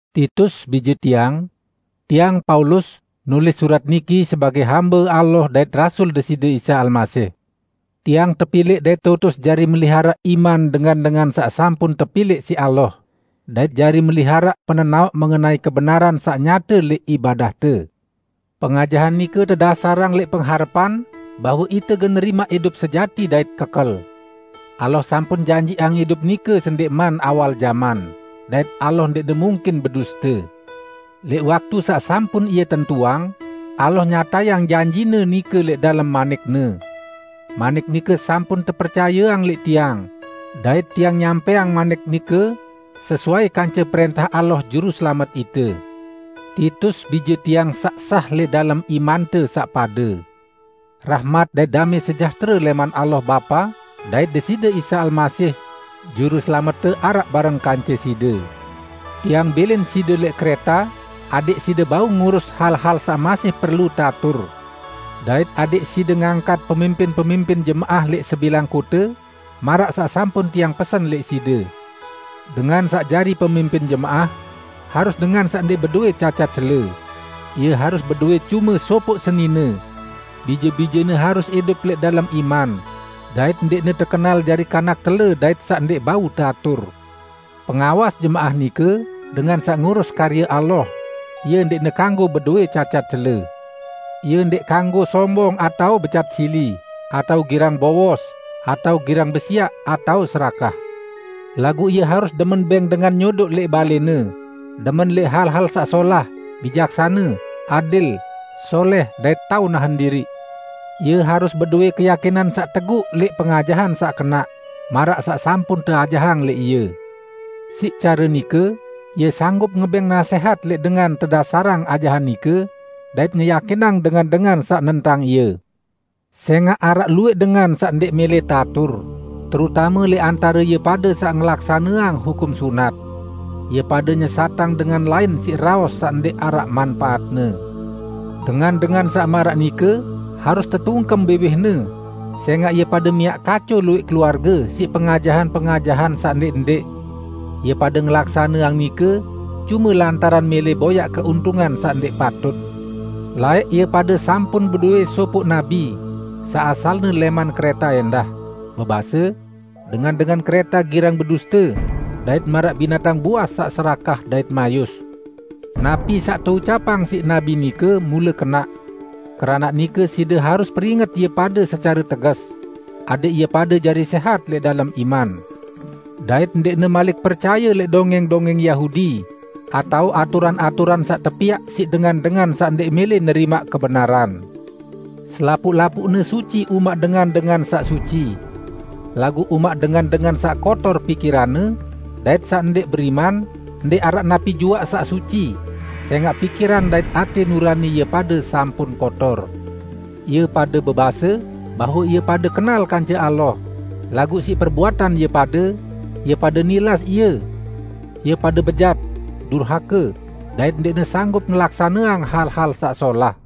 Titus, bije tiang! Tiang, Paulus, nulis surat niki sebagẽ hambe Allah dait rasul Deside Isa Almasih. Tiang tepilẽq dait teutus jari meliharaq iman dengan-dengan saq sampun tepilẽq siq Allah, dait jari meliharaq penenaoq mengenai kebenaran saq nyate lẽq ibadahte. Pengajahan nike tedasarang lẽq pengharepan bahwe ite gen nerimaq idup sejati dait kekel. Allah sampun janjiqang idup nike sendẽqman awal jaman -- dait Allah ndẽqne mungkin beduste. Lẽq waktu saq sampun Ie tentuang, Allah nyatayang janji-Ne nike lẽq dalem manik-Ne. Manik nike sampun tepercayeang lẽq tiang, dait tiang nyampẽang manik nike sesuai kance prẽntah Allah, Juruselamet ite. Titus, bije tiang saq sah lẽq dalem imante saq pade. Rahmat dait damẽ sejahtere lẽman Allah Bapa dait Deside Isa Almasih, Juruselamette araq bareng kance side. Tiang bilin side lẽq Kreta adẽq side bau ngurus hal-hal saq masih perlu teatur. Dait adẽq side ngangkat pemimpin-pemimpin jemaah lẽq sebilang kote, maraq saq sampun tiang pesen lẽq side: Dengan saq jari pemimpin jemaah harus dengan saq ndẽq bedowẽ cacat cele; ie harus bedowẽ cume sopoq senine; bije-bijene harus idup lẽq dalem iman dait ndẽqne tekenal jari kanak tele dait saq ndẽq bau teatur. Pengawas jemaah nike dengan saq ngurus karye Allah, ie ndẽqne kanggo bedowẽ cacat cele. Ie ndẽq kanggo sombong atao becat sili, atao girang bowos, atao girang besiaq atao serakah. Laguq ie harus demen bẽng dengan nyodoq lẽq balẽne, demen lẽq hal-hal saq solah, bijaksane, adil, solẽh dait tao nahen diriq. Ie harus bedowẽ keyakinan saq teguq lẽq pengajahan saq kenaq, maraq saq sampun teajahang lẽq ie. Siq care nike ie sanggup ngebẽng nasẽhat lẽq dengan tedasarang ajahan nike, dait ngeyakinang dengan-dengan saq nentang ie. Sẽngaq araq luwẽq dengan saq ndẽq mẽlẽ teatur, terutame lẽq antare ie pade saq ngelaksaneang hukum sunat. Ie pade nyesatang dengan lain siq raos saq ndẽq araq manpaatne. Dengan-dengan saq maraq nike harus tetungkem biwihne, sẽngaq ie pade miaq kaco luwẽq keluarge siq pengajahan-pengajahan saq ndẽq-ndẽq. Ie pade ngelaksaneang nike cume lantaran mẽlẽ boyaq keuntungan saq ndẽq patut! Laẽq ie pade sampun bedowẽ sopoq nabi, saq asalne lẽman Kreta ẽndah, bebase, "Dengan-dengan Kreta girang beduste, dait maraq binatang buas saq serakah dait mayus." Napi saq teucapang siq nabi nike mule kenaq. Keranaq nike side harus peringet ie pade secare teges; adẽq ie pade jari sẽhat lẽq dalem iman dait ndẽqne malik percaye lẽq dongẽng-dongẽng Yahudi, atao aturan-aturan saq tepiaq siq dengan-dengan saq ndẽq mẽlẽ nerimaq kebenaran. Selapuq-lapuqne suci umaq dengan-dengan saq suci. Laguq umaq dengan-dengan saq kotor pikiranne dait saq ndẽq beriman, ndẽq araq napi juaq saq suci, sẽngaq pikiran dait atẽ nurani ie pade sampun kotor! Ie pade bebase bahwe ie pade kenal kance Allah, laguq siq perbuatan ie pade, ie pade nilas Ie. Ie pade bejat, durhake dait ndẽqne sanggup ngelaksaneang hal-hal saq solah.